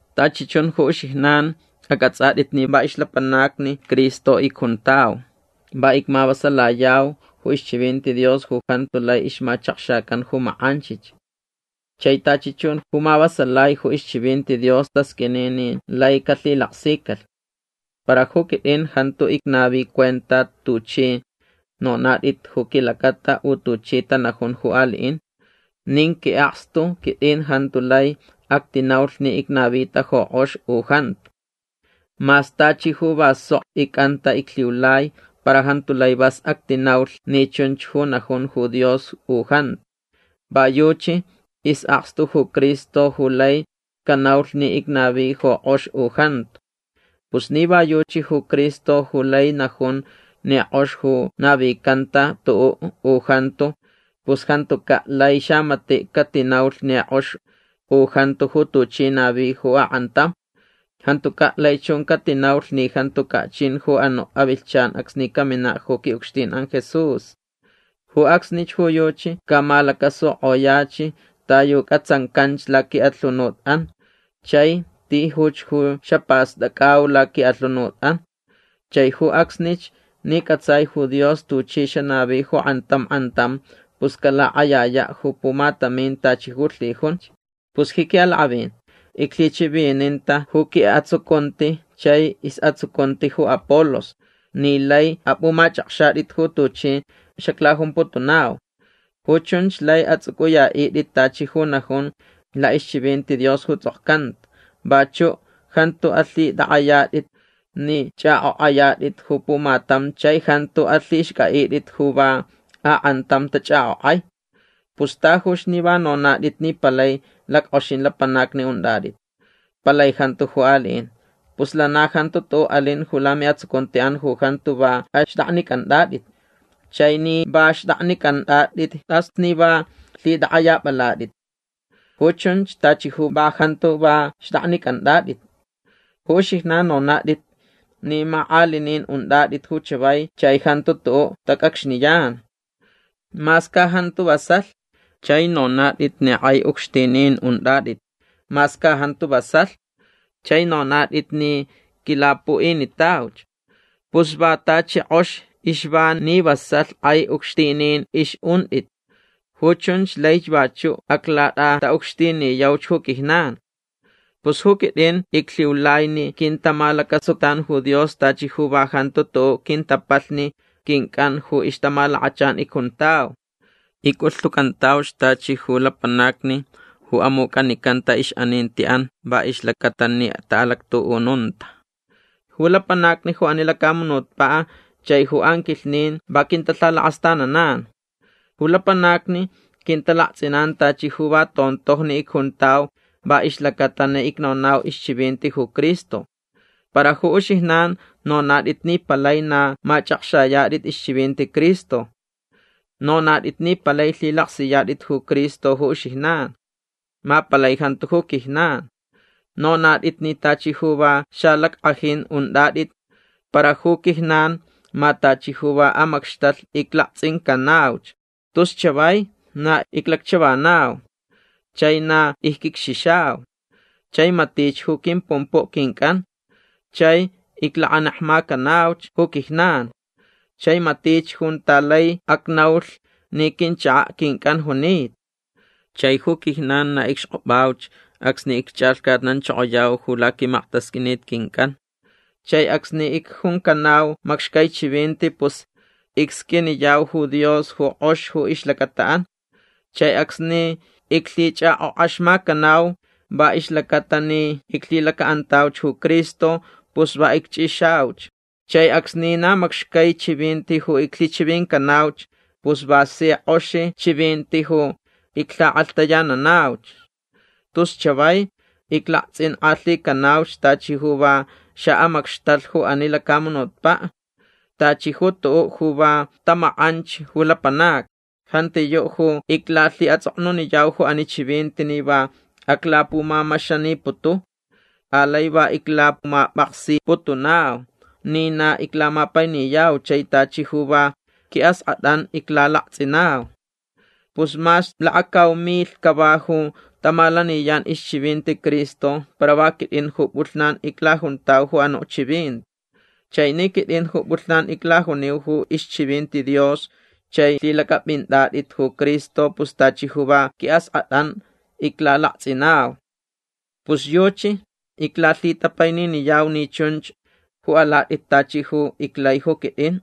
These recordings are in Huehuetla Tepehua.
Tachi chun ju uxijnan ac'ats'at'it ni va ixlapanacni Cristo icjuntau. Va icmavasalayau ju ixchivinti Dios ju jantu lai ixmachakxacan ju mak'anchich. Chai tachi chun ju mavasalai ju ixchivinti Dios tasq'uini ni lai calhilaksicalh. Para ju quit'in jantu icnavi cuenta tuch'i nonat'it ju quilacata u tuchi tanajun ju ali'in. Nin qui'akstu quit'in jantu lai actinaulh ni icnavita ju k'ox u jantu. Mas tachi ju va sok ic'anta iclhiulai para jantu lai vas actinaulh ni chunch ju najun ju Dios u jantu. Va yuchi is'akstu ju Cristo ju lai canaulh ni icnavi ju k'ox u jantu. Pus ni va yuchi ju Cristo ju lai najun ni k'ox ju navicanta tu'u' u jantu pus jantuca' lai xamati' catinaulh ni k'ox u jantu ju tuchi navi ju ak'antam. Jantuca' lai chun catinaulh ni jantuca' chin ju anu' avilhchan acsni camina' ju qui'ucxtin'an Jesús. Ju acsnich ju yuchi camalacasuk'oyach ta yu c'atsancan laqui'alhunut'an chai tijuch ju xapast'ac'au laqui'alhunut'an. Chai ju acsnich ni c'atsai ju Dios tuchi xanavi ju k'antam k'antam pus calak'ayaya' ju pumatamin tachi ju lhijunch. Pus ji qui'alak'avin iclhichivininta ju qui'atsucunti chai is'atsucunti ju Apolos ni lai ap'umach'akxat'it ju tuchi xaclajumputunau. Ju chunch lai ats'uc'uya'it'it tachi ju najun la'ixchivinti Dios ju ts'okcanta. Vachu' jantu alhit'ak'ayat'it ni ch'ak'ok'ayat'it ju pumatam chai jantu alhixc'a'it'it ju va ak'antam tach'ak'ok'ai. Pus tajuch ni va nonat'it ni palai lack'oxin lapanacni unt'at'it. Palai jantu ju ali'in. Pus lana jantu' tu'u' alin ju lami'atsucunti'an ju jantu va axt'aknic'ant'at'it. Chai ni va xt'aknic'ant'at'it t'as ni va lhit'ak'ayap'alat'it. Ju chunch tachi ju va jantu va xt'aknic'ant'at'it. Ju uxijnan nonat'it ni mak'alinin unt'at'it ju chavai chai jantu tu'u' tac'acxniyan. Mas ca jantu vasalh. Chai nonat'it ni k'ai ucxtinin unt'at'it. Mas ca jantu vasalh. Chai nonat'it ni quilapu'initauch. Pus vak tachi k'ox ixva ni vasalh k'ai ucxtinin ix'unt'it. Ju chunch laich vachu' aclat'ata'ucxtiniyauch ju quijnan. Pus ju quit'in iclhiulai ni quintamalacasutan ju Dios tachi ju va jantu tu'u' quintapalhni quinc'an ju ixtamalakachan icjuntau. Ic'ulhtucantauch tachi ju lapanacni ju amuc'anicanta ix'aninti'an va ixlacata ni ta'alactu'ununta. Ju lapanacni ju ani lacamunutpa' chai ju anquilhnin va quintalhalakast'ananan. Ju lapanacni quintalakts'inan tachi ju va tontojni icjuntau va ixlacata ni icnonau ixchivinti ju Cristo. Para ju uxijnan nonat'it ni palai na mach'akxayat'it ixchivinti Cristo. Nonat'it ni palai lhilaksiyat'it ju Cristo ju uxijnan. Ma palai jantu ju quijnan. Nonat'it ni tachi ju va xalack'ajin unt'at'it para ju quijnan ma tachi ju va amacxtalh iclakts'incanauch. Tus chavai na iclacchavanau. Chai na icquicxixau. Chai matich ju quimpumpu' quinc'an. Chai iclakanekmacanauch ju quijnan. Chai matich junta lai acnaulh ni quinchaka' quinc'an junita. Chai ju quijnan na icxk'op'auch acsni icch'alhcatnanchokoyau ju laquimaktasq'uinit quinc'an. Chai acsni icjuncanau macxcai chivinti pus icsq'uiniyau ju Dios ju k'ox ju ixlacata'an. Chai acsni iclhich'ak'ok'axmacanau va ixlacata ni iclhilaca'antauch ju Cristo pus va icch'ixauch. Chai acsni na macxcai chivinti ju iclhichivincanauch pus va si k'oxi chivinti ju iclhak'alhtayananauch. Tus chavai iclakts'ink'alhicanauch tachi ju va xa'amacxtalh ju ani lacamunutpa'. Tachi ju tu'u' ju va tamack'anch ju lapanacni. Jantiyu' ju iclalhi'ats'oknuniyau ju ani chivinti ni va aclapumamaxaniputu. Alai va iclamap'aksiputunau ni na iclamapainiyau chai tachi ju va qui'ask'at'an iclalakts'inau. Pus mas lakacau milh cava ju tamalaniyan ixchivinti Cristo para va quit'in ju p'ulhnan iclajuntau ju anu' chivinti. Chai ni quit'in ju p'ulhnan iclajuniu ju ixchivinti Dios chai lhilac'ap'int'at'it ju Cristo pus tachi ju va qui'ask'at'an iclalakts'inau. Pus yuchi iclalhitapaininiyau ni chunch ju alat'it tachi ju iclai ju quit'in.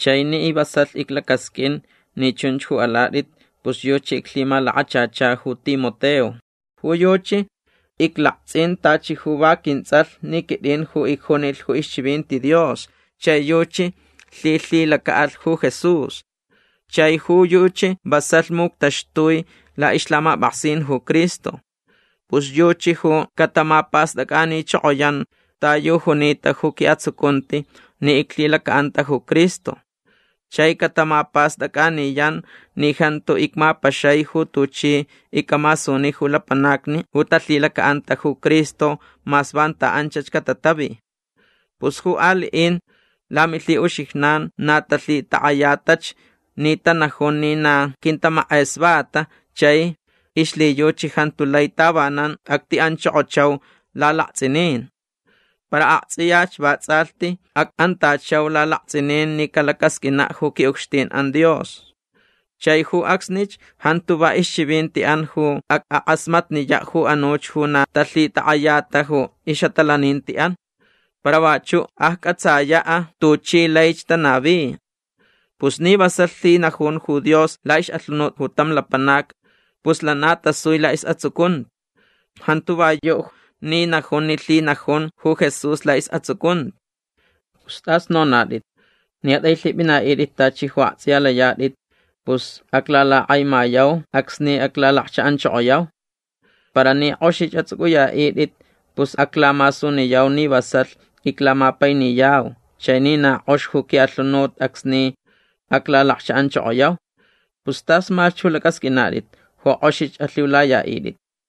Chai ni vasalh iclacasq'uin ni chunch ju alat'it pus yuchi iclhimalakachacha ju Timoteo. Ju yuchi iclakts'in tachi ju va quints'alh ni quit'in ju icjunilh ju ixchivinti Dios chai yuchi lhilhilaca'alh ju Jesús. Chai ju yuchi vasalh muctaxtui la'ixlhamap'aksin ju Cristo. Pus yuchi ju catamapast'ac'anichokoyan ta yu junita ju qui'atsucunti ni iclhilaca'anta ju Cristo. Chai catamapast'ac'aniyan ni jantu icmapaxai ju tuchi ic'amasuni ju lapanacni ju talhilaca'anta ju Cristo mas vanta anchach catatavi. Pus ju ali'in lamilhi'uxijnan na talhitak'ayatach ni tanajun ni na quintamak'esvata chai ixlhiyuchi jantu lai tavanan acti'anchokochau lalakts'inin. Para akts'iyach vats'alhti ac'antachau lalakts'inin ni calacasq'uina' ju qui'ucxtin'an Dios. Chai ju acsnich jantu va ixchivinti'an ju ac'ak'asmatniya' ju anuch ju na talhitak'ayata ju ix'atalaninti'an. Para vachu' acc'atsaya' tuchi laich tanavi. Pus ni vasalh lhinajun ju Dios la'ix'alhunut ju tam lapanac pus lana tasui la'is'atsucunti. Jantu va yu' ni najun ni lhinajun ju Jesús la'is'atsucunti. Pus t'as nonat'it. Ni at'ailhip'ina'it'it tachi ju akts'iya layat'it pus aclalakak'aimayau acsni aclalakcha'anchokoyau. Para ni k'oxich ats'uc'uya'it'it pus aclamasuniyau ni vasalh iclamapainiyau chai ni na k'ox ju qui'alhunut acsni aclalakcha'anchokoyau. Pus tasmalhch ju lac'asq'uinat'it ju k'oxich alhiulaya'it'it.